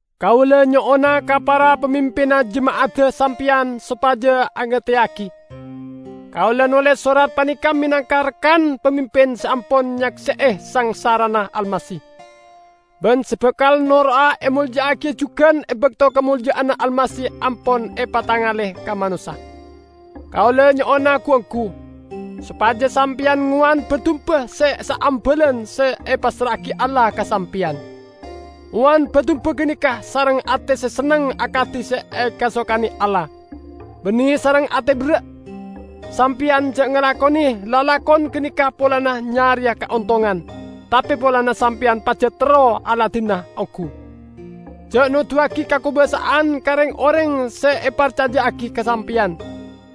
Kaula nyo'ona ka para pamimpinna jema'adda sampeyan sopaja agateyagi. Kaula noles sorat paneka menangka rekan pamimpin se ampon nyakse'e sangsarana Almasih, ban se bakal noro'a emolja'agiya jugan e bakto kamolja'anna Almasih ampon epatengale ka manossa. Kaula nyo'ona gu-onggu sopaja sampeyan ngowan ba-dumba se saambalan se epassra'agi Allah ka sampeyan. Owan ba-dumba ganeka sareng ate se senneng akadi se ekasokane Allah, banne sareng ate berra'. Sampeyan ja' ngalakone lalakon ganeka polana nyareya kaontongan, tape polana sampeyan pajat terro aladinana onggu. Ja' noduwagi kakobasa'an ka reng-oreng se eparcaja'agi ka sampeyan,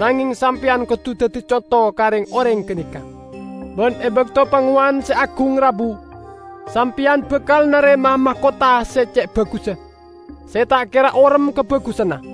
nangeng sampeyan kodu daddi conto ka reng-oreng ganeka. Ban e bakto Pangowan Se Agung rabu, sampeyan bakal narema'a makotha se ce' bagussa, se ta' kera orem kabagusanna.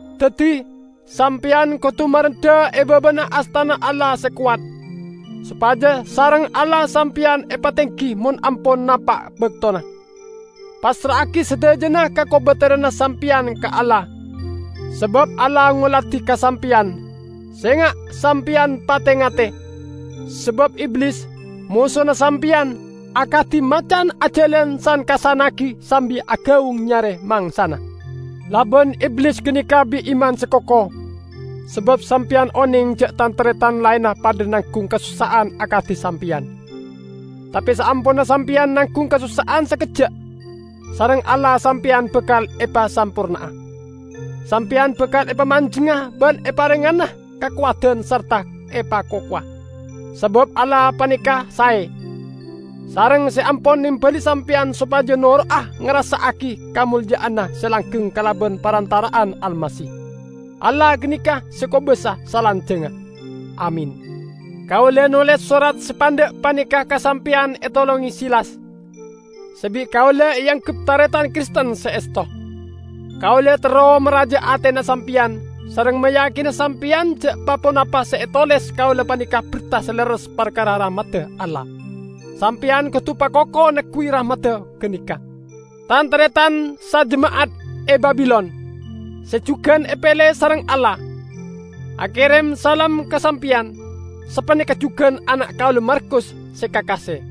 Daddi, sampeyan kodu marendha e babana astana Allah se kowat, sopaja sareng Allah sampeyan epatenggi mon ampon napa' baktona. Passra'agi sadajana kakobateranna sampeyan ka Allah, sabab Allah ngoladi ka sampeyan. Senga' sampeyan pate-ngate! Sabab Iblis, mosona sampeyan, akadi macan ajalan san-kassannagi sambi agaung nyare mangsana. Laban Iblis ganeka bi' iman se koko, sabab sampeyan oneng ja' tan-taretan laenna padha nanggung kasossa'an akadi sampeyan. Tape saamponna sampeyan nanggung kasossa'an sakejja', sareng Allah sampeyan bakal epasamporna'a. Sampeyan bakal epamanjengnga ban eparengngana kakowadan sarta epakokowa. Sabab Allah paneka sae, sareng se ampon nembali sampeyan sopaja noro'a ngarassa'agi kamolja'anna se langgeng kalaban parantara'anna Almasih. Allah ganeka se kobasa salanjangnga! Amin. Kaula noles sorat se pandha' paneka ka sampeyan etolonge Silas, se bi' kaula eanggep taretan Kristen se esto. Kaula terro maraja'a atena sampeyan, sareng mayakina sampeyan ja' pa-ponapa se etoles kaula paneka berta se lerres parkara rahmadda Allah. Sampeyan kodu pakoko neggu'i rahmat ganeka. Tan-taretan sajema'at e Babilon, se jugan epele sareng Allah, akerem salam ka sampeyan; sapaneka jugan ana' kaula Markus se kakase.